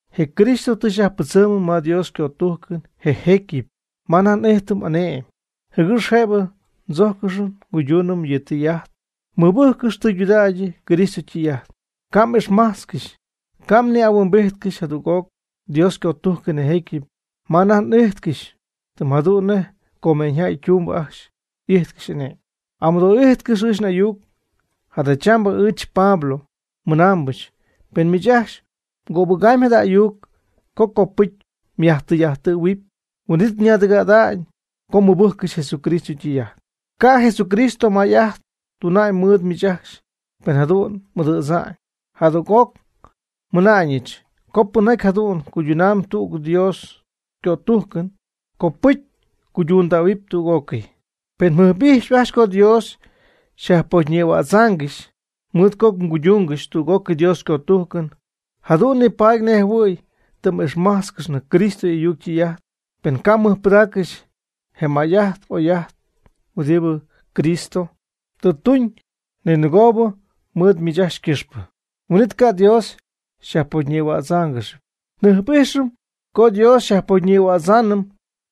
Je Cristo tɨ xyajpɨdzɨmɨm ma Dios ycötujcɨn je jecyɨp ma anajty n'ijtɨm y'ane'my, jɨgɨx jëbɨ tzojcɨngɨ́x nguyduunɨm yɨ' ytɨy'ajt. Mɨbɨjccɨxy tɨydudägy Cristo ytɨy'ajt, ca' m'ixmajtzcɨxy. Ca' mni'ahuimbíjtcɨxɨpy jadüg'oc Dios ycötujcɨn je jecyɨp ma anajty m'ijtcɨxy tɨm jadu'n nej comeeñyjäy ytumbɨ ajcxy y'ijtcɨxy ane'my. Amɨdoo'ijtcɨx ɨɨch n'ayuc. Jadachambɨ ɨɨch Pablo mɨnaambɨch pen miich ajcxy mgöbɨgamyb jada ayuc co copɨcy myajtɨy'ajtɨ̈huɨpy, huin'it ñaadɨgɨ̈'ada'ñ co mmɨbɨjccɨxy Jesucristo ytɨy'ajt. Ca' Jesucristo may'ajt tuna'ñ mɨɨd miich ajcxy pen jadu'n m'ɨdɨ̈dza'ñ. Jadüg'oc nmɨna'ñɨch co pɨnjaty jadu'n ycuydunamyb tüg Dios ycötujcɨn, copɨcy ycuydundähuɨpy tüg'ócɨy. Pen mjɨjp'ijxyp ajcxy co Dios xyajpocyñïhuätzaangɨxy mɨɨd co mguyduungɨxy tüg Dios ycötujcɨn, jadu'n nipaady nej jɨhuɨ̈y tɨ m'ixmájtzcɨxnɨ Cristo y'ayuc ytɨy'ajt. Pen ca' mmɨjpɨdaaccɨxy je may'ajt oy'ajt huɨdibɨ Cristo tɨ tuñ ninɨgoob mɨɨd miich ajcxy ycɨxpɨ, huin'it ca' Dios xyajpocyñïhuáatzcɨxɨpy. Njɨjp'ijxɨm co Dios xyajpocyñïhuädzaanɨm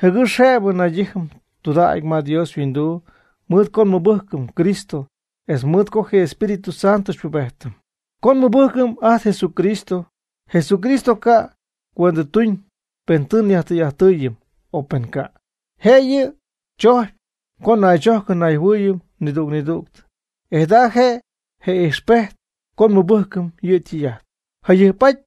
jɨgɨx jëbɨ naydijɨm tudägy ma Dios yhuinduu mɨɨd co nmɨbɨjcɨm Cristo etz mɨɨd co je Espíritu Santo xypubejtɨm. Co nmɨbɨjcɨm ajt Jesucristo, Jesucristo ca' cuendɨtuñ pen tɨ nyajtɨy'ajttɨɨyɨm o pen ca'. Jëyɨ yɨ' tzocy co naychojcɨm nayjɨhuɨɨyɨm nidüg nidüg, e jada je' je ijxpejt co nmɨbɨjcɨm yɨ' ytɨy'ajt. Jayɨjp'aty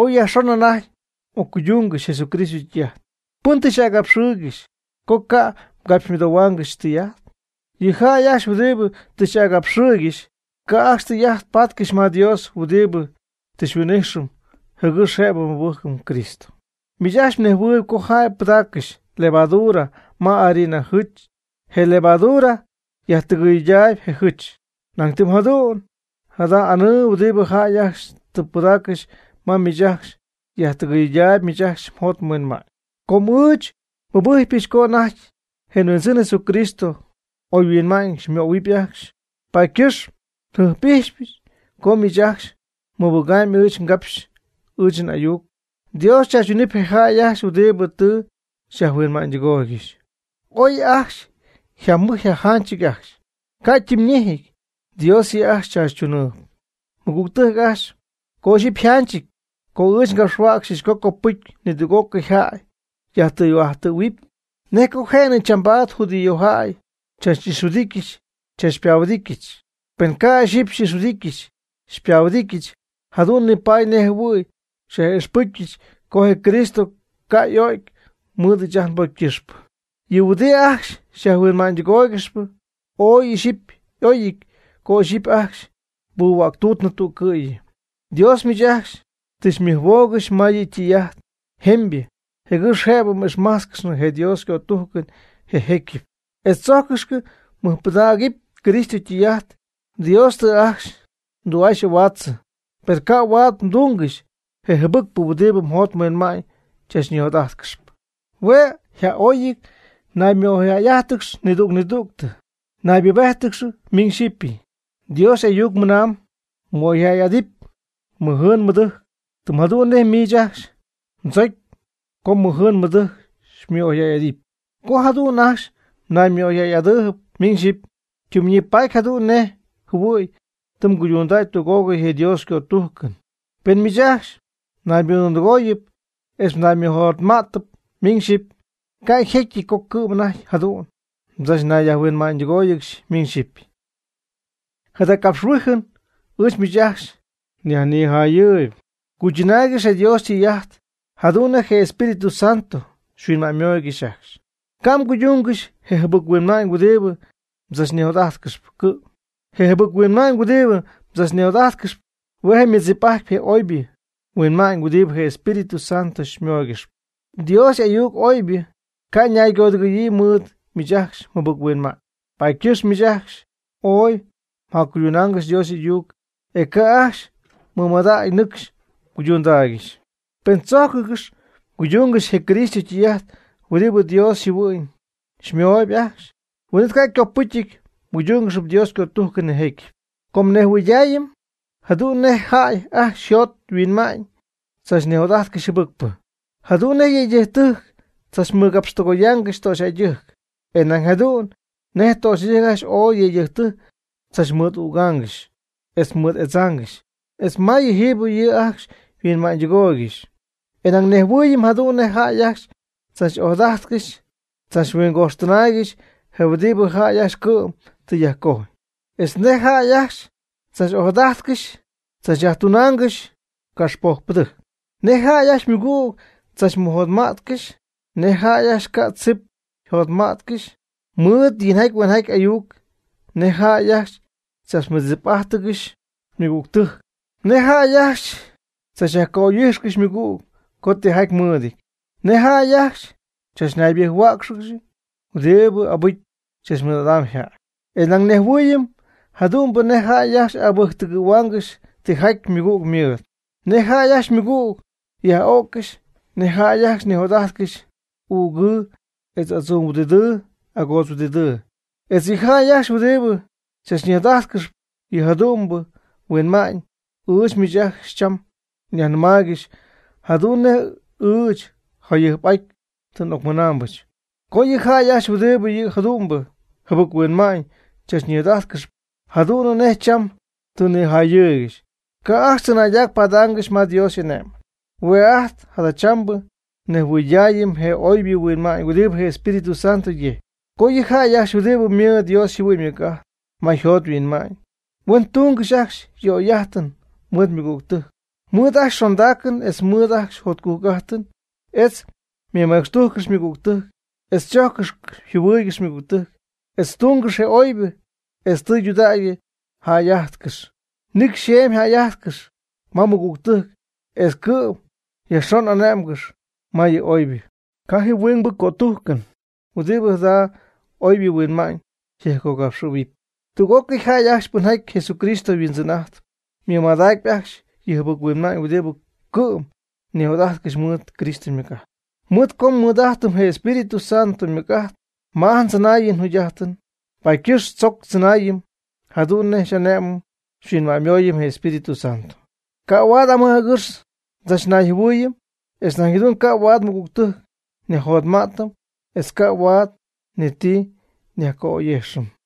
oy yajxon anajty m'occuydungɨxp Jesucristo ytɨy'ajt. ¿Pɨn tɨ xy'agapxɨɨygɨxy co ca' mgapxymɨdohuaangɨxy tɨy'ajt? Yɨ jäy ajcxy huɨdibɨ tɨ xy'agapxɨɨygɨxy ca' ajcxy tɨy'ajt patcɨxy ma je Dios huɨdibɨ tɨ xyhuin'ijxɨm jɨgɨx jëbɨ nmɨbɨjcɨm Cristo. Miich ajcxy mnejhuɨɨyb co jäy pɨdaaccɨxy levadura ma harina jɨch je levadura yajtɨgɨyɨydaayb je jɨch. Nañ tɨm jadu'n jada anɨɨ huɨdibɨ jäy ajcxy tɨ pɨdaaccɨxy ma miich ajcxy yajtɨgɨydähuamyb miich ajcxy mjot mhuinma'ñ. Com ɨɨch nmɨbɨjcpɨch co ajt je nHuindzɨn Jesucristo oyhuinma'ñ xymöhuɨpy ajcxy, paady ycɨxp njɨjp'ijxypɨch co miich ajcxy mmɨbɨgaamyb ɨɨch ngapxy ɨɨch n'ayuc. Dios chaachytunɨpy je jäy ajcxy huɨdibɨ tɨ xyajhuinma'ñydɨgooygɨxy. Oy ooy yjamɨj yjajanchɨty ajcxy, ca' ytimyñéjɨty, Dios yɨ' ajcxy tzaachytunɨɨb. Mɨgügtɨjc ajcxy, co ixyipy yjanchɨty co ɨɨch ngapxhuäcxyɨch co copɨcy nidüg'ócɨy jäy yajtɨy'ajttɨ̈huɨpy, ¿nej co je'nɨ chambaad judíojäy xychach'ixhuɨdityɨch xychachpahuɨdityɨch? Pen ca' ixyipy xy'ixhuɨdityɨch xypahuɨdityɨch jadu'n nipaady nej jɨhuɨ̈y nyaj'ixpɨcyɨch co je Cristo ca' y'o'cy mɨɨd ɨɨch ajt nbocy ycɨxpɨ. Yɨ' huɨdi ajcxy xyajhuinma'ñydɨgooygɨxyp, ooy ixyipy y'oyɨty co ixyipy ajcxy xypuhuäctuutnɨ tüccɨ̈yɨ. Dios miich ajcxy tɨ xymɨjhuoogɨxy ma yɨ' ytɨy'ajt jemybɨ jɨgɨx jëbɨ m'ixmájtzcɨxnɨ je Dios ycötujcɨn je jécyɨp, etz tzojcɨngɨ́x mɨjpɨdägɨpy Cristo ytɨy'ajt. Dios tɨ ajcxy mdü'aa xy'ahuaatzɨ, per ca' huaad mduungɨxy je jɨbɨcpɨ huɨdibɨ mjot mhuinma'ñ chachñijot'ajtcɨxpy. Hue' a'oy naymɨ'oyjäy'ájtɨgɨx nidüg nidüg, naybubéjtɨgɨx miñ xyipy. Dios y'ayuc ymɨna'ñ: “Mɨ'oyjäy'adɨpy mmɨjɨɨn mmɨdɨjc, tɨm jadu'n nej miich ajcxy mdzocy co mmɨjɨɨn mmɨdɨjc xymɨ'oyjäy'adɨpy.” Co jadu'n ajcxy mnaymɨ'oyjäy'adɨɨyb miñ yxipy, ytimyñipatyp jadu'n nej jɨhuɨ̈y tɨ mguydundäy tüg'ócɨy je Dios ycötujcɨn. Pen miich ajcxy mnaymɨdundɨgooyɨp etz mnaymɨjotma'tɨp miñ xyipy, ca' yjetyɨty co cɨ'm anajty jadu'n mdzachnayyajhuinma'ñydɨgóoyɨgɨxy miñ xyipy. Jada capxhuijɨn ɨɨch miich ajcxy nyajnijayɨɨyb. Cuychɨnaaygɨx je Dios ytɨy'ajt jadu'n nej je Espíritu Santo xyhuinma'ñymooygɨxy ajcxy. Ca' mguyduungɨxy je jɨbɨc-huinma'ñ huɨdibɨ mdzachnijot'ajtcɨxyp cɨ'm. Je jɨbɨc-huinma'ñ huɨdibɨ mdzachnijot'ajtcɨxyp, hue'ymɨdzip'ajtpy je oybɨ huinma'ñ huɨdibɨ je Espíritu Santo xymooygɨxp. Dios y'ayuc obyɨ ca' ñaygodɨgɨ̈yii mɨɨd miich ajcxy mjɨbɨc-huinma'ñ. Paady ycɨxp miich ajcxy ooy mjacuydunaangɨxy Dios y'ayuc, e ca' ajcxy mmɨmadäga'ñ ñɨcxy mguydundaaygɨxy. Pen tzojcɨngɨ́x mguyduungɨxy je Cristo ytɨy'ajt huɨdibɨ Dios yjɨhuɨ'ñ xymooyb ajcxy, huin'it ca' copɨcy mguydúngɨxɨpy Dios ycötujcɨn je jecyɨp. Com nnejhuɨydaayɨm jadu'n nej jäy ajcxy yjot yhuinma'ñ tzachnijot'ajtcɨxy jɨbɨcpɨ. Jadu'n nej yëydɨjctɨjc tzachmɨgapxtɨgoyaangɨxy töxyjäydɨjc; e nañ jadu'n nej töxyjäydɨjc ajcxy ooy yëydɨjctɨjc tzachmɨɨd'ügangɨxy etz mɨɨd'edzaangɨxy etz ma yɨjiibɨ ji ajcxy yhuinma'ñydɨgooygɨxy. E nañ nnejhuɨɨyɨm jadu'n nej jäy ajcxy tzach'ojadajtcɨxy tzachhuingoxtɨnaaygɨxy je huɨdibɨ jäy ajcxy cɨ'm tɨ yajcojy, etz nej jäy ajcxy tzach'ojadajtcɨxy tzachyajtunaangɨxy caxpojcpɨdɨjc, nej jäy ajcxy ymɨgüg tzachmɨjotma'tcɨxy; nej jäy ajcxy ca' tzip yjot'ambɨjccɨxy mɨɨd yinjaty huenjaty ayuc; nej jäy ajcxy tzachmɨdzip'ajtcɨxy ymɨgügtɨjc; nej jäy ajcxy tzachyajca'oy'ijxcɨxy ymɨgüg co tijaty mɨɨdɨty; nej jäy ajcxy chachnaybɨjc-huäcxáanɨgɨxy, huɨdibɨ abɨcy tzachmɨɨd'adamb yjäy. E nañ nnejhuɨɨyɨm jadu'n nej jäy ajcxy abɨjctɨgɨ̈huaangɨxy tijaty ymɨgüg ymɨɨd; nej jäy ajcxy ymɨgüg yaj'o'ccɨxy; nej jäy ajcxy nijot'ajtcɨxy ügɨɨ etz adzuuhuɨdidɨɨ agoodzhuɨdidɨɨ, etz yɨ jäy ajcxy huɨdibɨ tzachnijot'ajtcɨxp yɨ jadu'mbɨ huinma'ñ. Ɨɨch miich ajcxy cham njacyajnɨmaaygɨxy jadu'n nej ɨɨch jayɨjp'aty tɨ n'ocnigapxpɨch, co yɨ jäy ajcxy huɨdibɨ yɨ jadu'mbɨ jɨbɨc-huinma'ñ chachnijot'ajtcɨxp jadu'n nej cham tɨ nijayɨɨygɨxy, ca' ajcxy tzɨnaydac paadaangɨxy ma Dios y'ane'my. Hue' ajt jadachambɨ nejhuɨydaayɨm je oybɨ huinma'ñ huɨdibɨ Espíritu Santo yejcyp. Co yɨ jäy ajcxy huɨdibɨ ymɨɨd Dios yjɨhuɨ'ñ ymɨc'ajt ma yjot yhuinma'ñ, hue' ytungɨxyp ajcxy yɨ oyjäy'ajtɨn mɨɨd ymɨgügtɨjc; mɨɨd ajcxy xondaacɨn etz mɨɨd ajcxy jotcujc'ajtɨn; etz ymɨmecxtujcɨxyp ymɨgügtɨjc; etz chojccɨxyp yjɨhuɨɨygɨxyp ymɨgügtɨjc; etz ytungɨxp oybɨ; etz tudägy yjäy'ajtcɨxyp, nicy xeemy yjäy'ajtcɨxy ma ymɨgügtɨjc; etz cɨ'm yajxon ñay'ané'mɨgɨxy ma yɨ oybɨ. Ca' ji huingbɨ cötujcɨn huɨdibɨ jada oybɨ huinma'ñ jɨjpcogapxɨ̈huɨpy. Tüg'ócɨy jäy ajcxy pɨnjaty Jesucristo Huindzɨn'ajtp, mɨmadacpy ajcxy yɨ jɨbɨc-huinma'ñ huɨdibɨ cɨ'm nijot'ajtcɨxyp mɨɨd Cristo ymɨc'ajt. Mɨɨd co nmɨɨd'ajtɨm je Espíritu Santo ymɨc'ajt ma ajt ndzɨnaayɨn njugy'ajtɨn, paady ycɨxp tzoc tzɨnaayɨm jadu'n nej xy'ane'mɨm xyhuinma'ñymooyɨm je Espíritu Santo. Ca' huaad amɨj agɨx ndzachnayjɨhuɨɨyɨm, etz nañ jadu'n ca' huaad nmɨgügtɨjc nyajjotma'tɨm; etz ca' huaad ni ti nyajca'oy'ijxɨm.